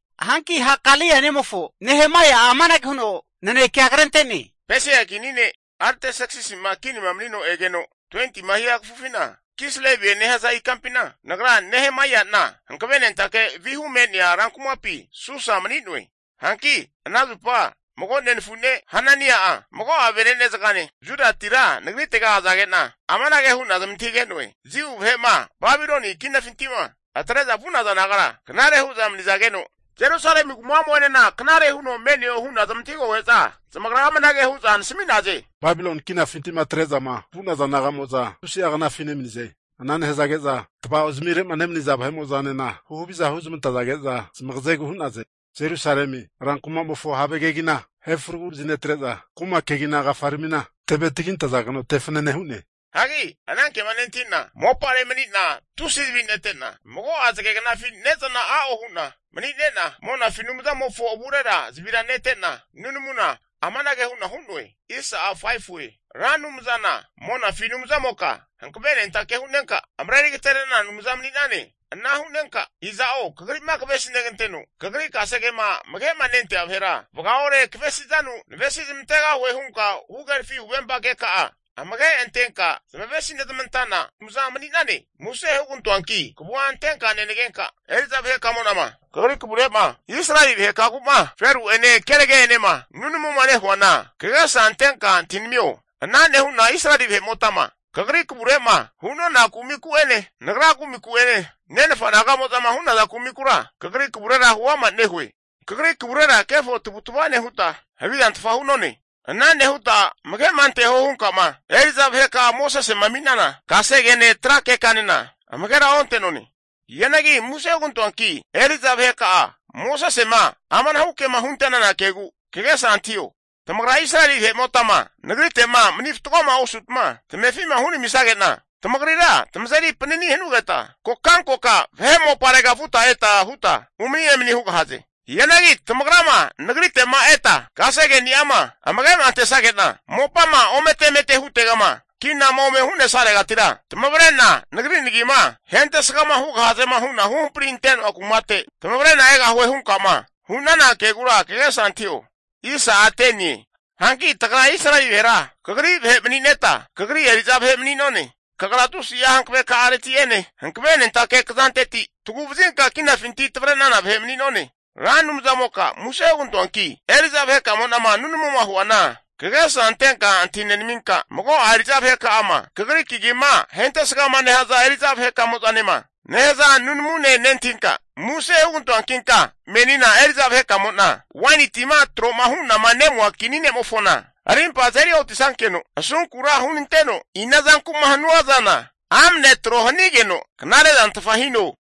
Hanki Hakalia nemofo Nehemaia'a amanage huno naneke'a krente'ne, Pesia kini ne' Artserksisi'ma kinima manino egeno 20tima hia kafufina, Kislevie nehaza ikampina nagra Nehemaia'na hankavenentake vihu me'nea ran kumapi Susa mani'noe. Hanki ana zupa mago nenafu ne' Hanani'a mago'a venene'zagane Judatira nagritega azage'na, amanage hu'na zamantahige'noe, Jiu vahe'ma Babiloni kinafinti'ma atre'za vu'naza nagara knare huza mani'zageno, Jerusalemi kuma'mo'enena knare huno me'neo hu'na zamantahigoge'za, zamagra amanage hu'za nasami'naze, Babiloni kinafinti'ma atre'zama vu'naza naga'mo'za tusi'a knafi nemanize. Ana nehazage'za tva'ozamire'ma nemaniza vahe'mo'zanena huhaviza huzmantazage'za zmagazegu hu'naze. Jerusalemi rankumamofo have kegina ahe fragu vazinetre'za, kuma kegina kafaramina teve tagintazageno te fanane hu'ne. Hagi anankema nentahi'na, mopare mani'na tusi zavi nete'na mago'a zage knafi ne'zana a'o hu'na mani'nena, monafi Anumzamofo avurera zavira netena nunamuna amanage hu'na hu'noe. Ra Anumzana monafi Anumzamoka hankavenentake hu'nenka marerigaterenana Anumza mani'nane. Ana hu'nenka iza'o kagri'ma kavesi neganteno kagri kasegema amage'ma nentea vahera, vagaore kavesizanu navesi zamantegahue hunka huhagerafi huvempa keka'a amage antenka zamavesi nezamantana Anumza mani'nane. Muse hugantoanki kavua antenka nenagenka, eri'za vahekamo'nama kagri kavure'ma Israeli vahekagu'ma, feru'ene kenage'enema nunamuma nehuana kagesa antenka antahinamio. Ana nehu'na Israeli vahe'motama kagri kavure'ma hu'nona kumiku'ene, nagra kumiku'ene, nenafa naga'mozama hu'naza kumikura kagri kavure huama nehue. Kagri kavurera kefo tavutva nehuta, havizantfa hu'none. Ana nehuta amage'ma anteho hunkama eri'za vaheka'a Mosesema ami'nana kasegene tra kekanena amagera onte'none. Hianagi muse hugantoanki eri'za vaheka'a Mosesema amanahu ke'ma hunte'nana kegu kagesa antahio. Tamagra Israeli vahe'motama Nagrite'ma mani fatgoma osutma tamefi'ma hunamisage'na, tamagrira tamazeri panani hanugetma kokankoka vahe moparega vuta eta huta umani emani hugahaze. Hianagi tamagrama Nagrite'ma eta kasegeni'ama amage'ma antesage'na, mopama omete emete hutegama kinama ome hu'nesaregatira tamavre'na Nagri nagima hentesga hugahazema hunama huhampri ante'noa kumate tamavre'na egahue hunka'ma hu'nana kegura kagesa antahio. Hanki tagra Israeli vahera Kagri vahe mani'neta Kagri eri'za vahe mani'none. Kagra tusi'a hankaveka'areti'ene, hankavenentake kzanteti taguvazinka kinafinti tavre'nana vahe mani'none. Ra Anumzamoka muse hugantoanki eri'za vahekamo'nama nunamuma huana kagesa antenka antahi nenaminka, mago'a eri'za vaheka'ama Kagri kagima ahentesgama nehaza eri'za vahe'kamozanema nehaza nunamune nentahinka, muse hugantoankinka menina eri'za vahekamo'na, waini tima tro'ma hu'nama nemua kini ne'mofona arimpa azeri otisankeno asunkura hunanteno, inazanku'ma hanua zana amne tro hanigeno knare'zantfa hino.